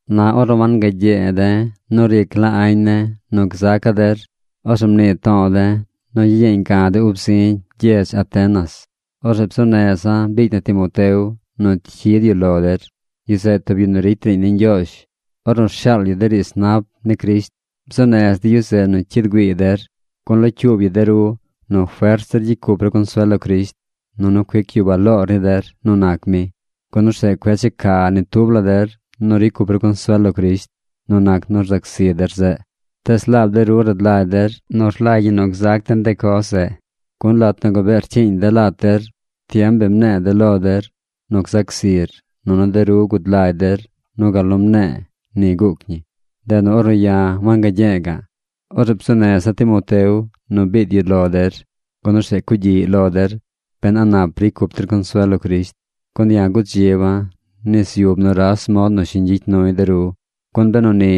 Na ornu wangagye̱e̱ de̱ nu ricy la añ ne̱ nu gzaca̱ der, orzeꞌ mnii to̱o̱ de̱ nu gyiyeeñ ga̱ de̱ ub zi̱ gyedz Atenas. Orzeꞌ bzuu neza̱ biicy na Timoteo nu cyid yu lo der. Yu zeꞌ tub yu nu ricy riiñ ni Ñgyoozh ornu rshaal yu de riidz nap ni Crisht. Bzuu nez de̱ yu zeꞌ nu cyid güiiy der, gun locyuub yu de ru nu fert zir gyicy cup ru consuel lo Crisht, nunu cuic yu baloor ni der nu nac mi. Gun orzeꞌ cueꞌ checa ni tub la der nu ricy cup ru consuel lo Crisht nu nac nu rzac zi der zeꞌ. Tees laab de ru rad lagy der nu rlagy ñi nu gzac den de coz zeꞌ. Gun lat nu gabee rcyiiñ de̱ lat der, tiem bi mne̱e̱ de̱ lo der nu gzac zir, nunu de ru gud lagy der nu gal nu mne̱e̱, ni guuc ñi. Ndeꞌ nu ornu ya̱ wangagye̱e̱ ga̱ꞌ, orzeꞌ bzuu neza̱ Timoteo nu biid yu lo der, gun orzeꞌ cugyiꞌy lo der ben a nap ricy cup der consuel lo Crisht. Gun ya̱ gudziba̱ nis yub nuras mod nu shiñ gyicy nuy de ru. Gun benu ni,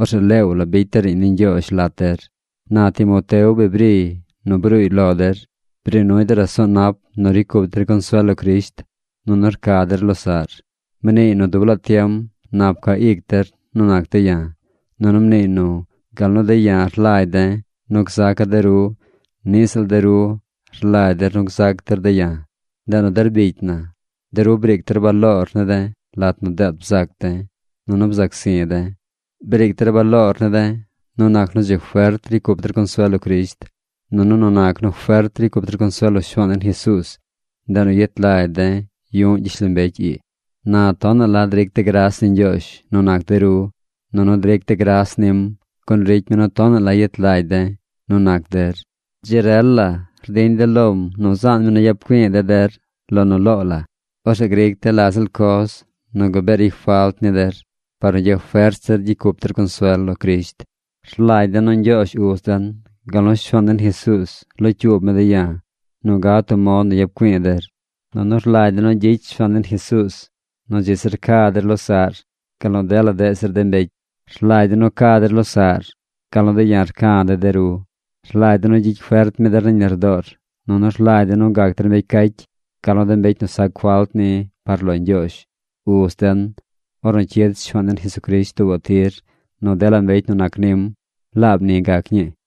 orzeꞌ leew la bicy de̱ riiñ ni Ñgyoozh lat der. Na Timoteo bi briy nu bruuy lo der. Bri nuy de raso̱o̱ nap nu ricy cup der consuel lo Crisht, nunu rca der losaꞌr. Mniiy nu dub laa tiem nap ca ic der nu nac de̱ ya̱. Nunu mniiy nu gal nu de̱ ya̱ rlagy de̱ nu gzaca̱ de ru, niꞌ ziꞌl de ru rlagy der nu gzac der de̱ ya̱. Ndeꞌ nu der bicy na, de ru briic der baloor ne̱ de̱ lat nu deet bzac de̱, nunu bzac zi̱ de̱. Briic der baloor ne̱ de̱ nu nac nu dzi fert ricy cup der consuel lo Crisht. Nunu nu nac nu fert ricy cup der consuel lo Shuaan den Jesuuz, ndeꞌ nu yet lagy de̱ yu̱ꞌ gyishlombecy ii. Na tonaꞌ la dric de̱ gras ni Ñgyoozh nu nac de ru, nunu dric de̱ gras nim, gun ricy mi nu tonaꞌ la yet lagy de̱ nu nac der. Dzi rel la rdiñ de̱ lom nu zaan mi nu yap güi̱i̱ de̱ der lo nu loo la. Orzeꞌ gric de̱ la ziꞌl coz nu gabee ricy falt ni der par nu gyafert zir gyicy cup der consuel lo Crisht. Rlagy de̱ nu Ñgyoozh Uz den, gal nu Shuaan den Jesuuz locyuub mi de̱ ya̱ nu gad tub mod nu yap güi̱i̱ der. Nunu rlagy de̱ nu gyicy Shuaan den Jesuuz nu dzi zir ca der losaꞌr gal nu dela deꞌ zir de mbecy. Rlagy de̱ nu ca der losaꞌr gal nu de̱ ya̱ rca̱ de̱ de ru. Rlagy de̱ nu gyicy fert mi der nañ lardoor, nunu rlagy de̱ nu gac der mbecy cacy, gal nu mbecy nu sac falt ni par lo Ñgyoozh, Uz den, ornu cyid Shuaan den Jesucrisht tuubaꞌ tir nu dela mbecy nu nac nim. ¡Laab ni gac ñii!